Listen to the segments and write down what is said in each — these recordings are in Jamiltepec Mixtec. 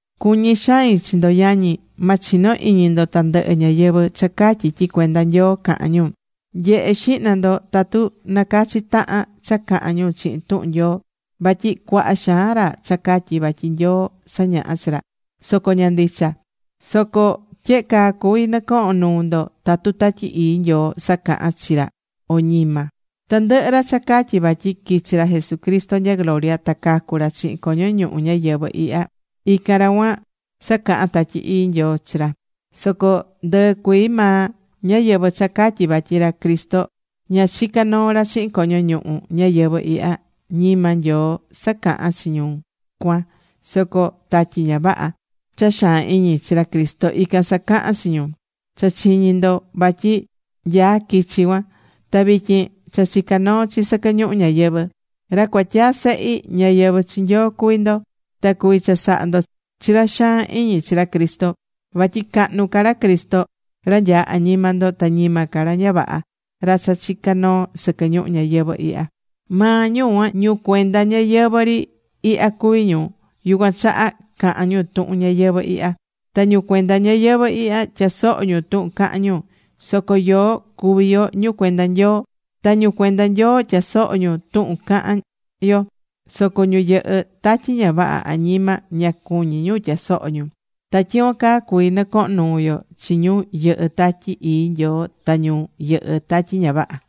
Cuñí xain chi ndo, yañi. Ma chino iñi ndo tandɨhɨ ñáyɨvɨ cha catyí tyi cuenda Nyoo cahán ñu. Nye̱he xihna ndo tatu nacachí tahan cha cahán ñu chihin tuhun Nyoo. Vatyi cuaha xaan ra cha catyí vatyi Nyoo sañahá chi ra. Soco ña ndicha. Soco tyehe caa cuví nɨcohon nuu ndo tatu Tatyi Ii Nyoo sacahán chi ra o ñima. Tandɨhɨ ra cha catyí vatyi quichi̱ ra Jesucristo nya gloria ta cacu̱ ra chihin coño ñuhu ñayɨvɨ̱ ihya, ican ra cuan, sacahán Tatyi Ii Nyoo chi ra. Soco ndɨɨ cuii maa ñáyɨvɨ cha catyí vatyi ra Cristo ña chica̱ noo ra chihin coño ñuhu ñayɨvɨ̱ ihya, ñima Nyoo sacahán chi ñu cuan, soco tatyi ña vaha, cha xaan iñi chi ra Cristo, ican sacahán chi ñu. Cha chiñi̱ ndo vatyi nyaá quichi cuan. Ta vityin cha chicá noo chi sɨquɨ ñuhu ñayɨvɨ̱. Ra cuatyaa sehi, ñáyɨvɨ chi Nyoo cuví ndo. Ta cuví chasaha ndo chi ra xaan iñi chi ra Cristo. Vatyi cahnu ca ra Cristo, ra nyaá añima ndo ta ñima ca ra ña vaha, ra cha chicá noo sɨquɨ ñuhu ñayɨvɨ̱ ihya. Maa ñu cuan, ñu cuenda ñayɨvɨ̱ ri ihya cuví ñu. Yucuan chaha cahán ñu tuhun ñayɨvɨ̱ ihya. Ta ñu cuenda ñayɨvɨ̱ ihya tyasohó ñu tuhun cahán ñu. Soco yoó cuví yo ñu cuenda Nyoo. Ta ñu cuenda Nyoo tyasohó ñu tuhun cahán yo, soco ñu yɨhɨ́ tatyi ña vaha añima, ña cuñí ñu tyasoho ñu. Ta tyicuan caa cuví nɨcohon nuu yo chi ñu yɨhɨ́ Tatyi Ii Nyoo ta ñu yɨhɨ tatyi ña vaha.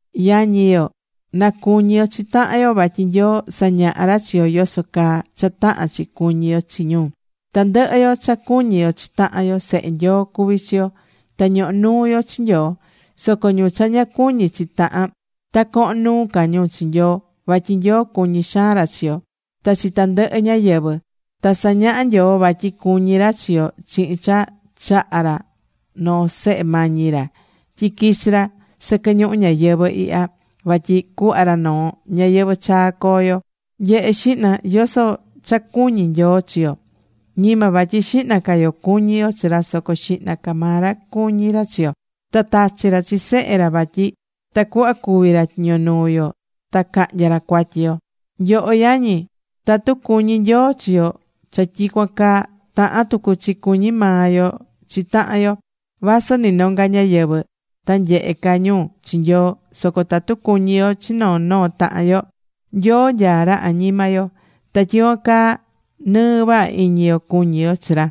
Yañi yo, na cuñi yo chi tahan yo, vatyi Nyoo sañahá ra chi yo yoso caa cha tahán chi cuñi yo chi ñu. Tandɨhɨ yo cha cuñí yo chi tahan yo sehe Nyoo cuví chi yo, ta ñohó nuu yo chi Nyoo. Soco ñu cha ña cuñí chi tahan, ta cohon nuu ca ñu chi Nyoo, vatyi Nyoo cuñí xaan ra chi yo ta chi tandɨhɨ ñáyɨvɨ. Ta sañaha̱ Nyoo vatyi cuñí ra chi yo chihin cha chaha̱ ra noo Sehe mañi ra tyi quichi̱ ra sɨquɨ ñuhu ñayɨvɨ̱ ihya, vatyi cuhva ra noo ñayɨvɨ̱ chaa coo yo. Nye̱he xihna, yoso cha cuñí Nyoo chi yo. Ñima vatyi xihna ca yo cuñí yo chi ra, soco xihna ca maa ra cuñí ra chi yo. Ta tachi̱ ra chi Sehe ra vatyi tacuhva cúvi ra tyiño nuu yo ta cahnya ra cuatyi yo. Nyoho yañi, tatu cuñí Nyoo chi yo cha tyicuan caa, tahán tucu chi cuñí maa yo chi tahan yo. Vasɨ nɨ nonga ñáyɨvɨ, ta nyehe ca ñu chi Nyoo, soco tatu cuñí yo chi noo noo tahan yo, Nyoo nyaá ra añima yo. Ta tyicuan caa nɨɨ vaha iñi yo cuñí yo chi ra.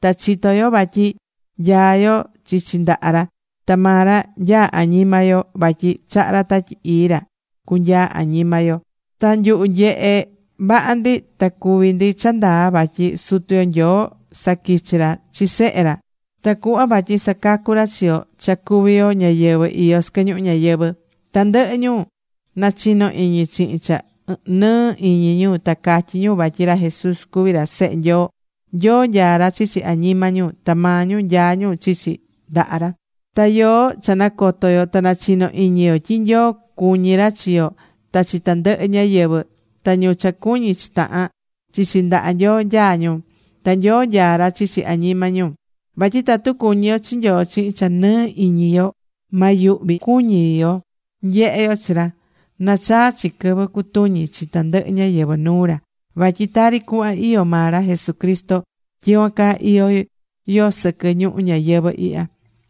Ta chitó yo vatyi nyaá yo chichi ndaha ra, ta maa ra nyaá añima yo vatyi chaha̱ ra Tatyi Ii ra cunyaa añima yo. Ta nyuhu nyehe̱ vaha ndi ta cuví ndi cha ndaa vatyi Sutu yo Nyoo saquichi̱ ra chi Sehe ra tacuhva vatyi sacacu ra chi yo cha cuví yo ñáyɨvɨ iyó sɨquɨ ñuhu ñayɨvɨ̱. Tandɨhɨ ñu nachinó iñi chihin cha nɨɨ iñi ñu ta catyí ñu vatyi ra Jesús cuví ra Sehe Nyoo, Nyoo nyaá ra chichi añima ñu. Ta maa ñu nyaá ñu chichi ndaha ra. Ta yoó cha nacoto yo ta nachino iñi yo tyi Nyoo cuñí ra chi yo, ta chi tandɨhɨ ñáyɨvɨ. Ta ñu cha cuñí chi tahan, chichi ndaha Nyoo nyaá ñu. Ta Nyoo nyaá ra chichi añima ñu. Vatyi tatu cuñí yo chi Nyoo chihin cha nɨɨ iñi yo ma yuhvi cuñi yo nyehe yo chi ra, nachaa chi quɨvɨ cutuñi chi tandɨhɨ ñáyɨvɨ nuu ra. Vatyi tari cuhva iyó maa ra Jesucristo, tyicuan caa iyó yo sɨquɨ ñuhu ñayɨvɨ̱ ihya.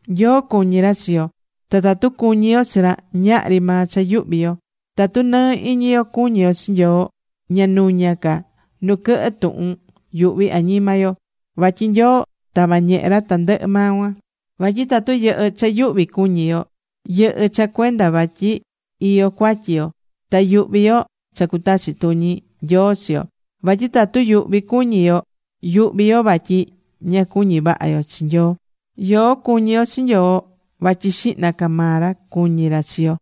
Nyoo cuñí ra chi yo, ta tatu cuñí yo chi ra, ñahri maa cha yuhví yo. Tatu nɨɨ iñi yo cuñí yo chi Nyoo ña nuña ca nu quɨhɨ tuhun yuhví añima yo, vatyi Nyoo tava̱ ñehe ra tandɨhɨ maa cuan. Vatyi tatu yɨhɨ́ cha yuhvi cuñi yo, yɨhɨ́ cha cuenda vatyi iyó cuatyi yo. Ta yuhví yo cha cutachi tuñi Nyoo chi yo. Vatyi tatu yuhvi cuñí yo, yuhví yo vatyi ña cuñí vaha yo chi Nyoo. Yoó cuñí yo chi Nyoo vatyi xihna ca maa ra cuñí ra chi yo.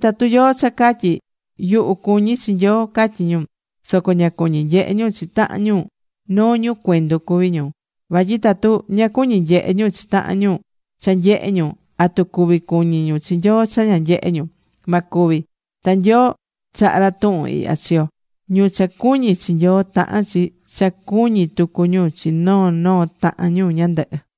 Tatu yóó cha catyí: “Yuhu cuñí chi Nyoo”, catyí ñu, soco ña cuñí nyehe ñu chi tahan ñu, noo ñu cuendu cuví ñu. Vatyi tatu ña cuñí nyehe ñu chi tahan ñu cha nyehé ñu, ¿atu cuví cuñí ñu chi Nyoo cha ña nyehé ñu? Ma cuvi. Ta Nyoo chaha̱ ra tuhun ihya chi yo: Ñu cha cuñí chi Nyoo, tahán chi cha cuñí tucu ñu chi noo noo tahan ñu ñandɨhɨ.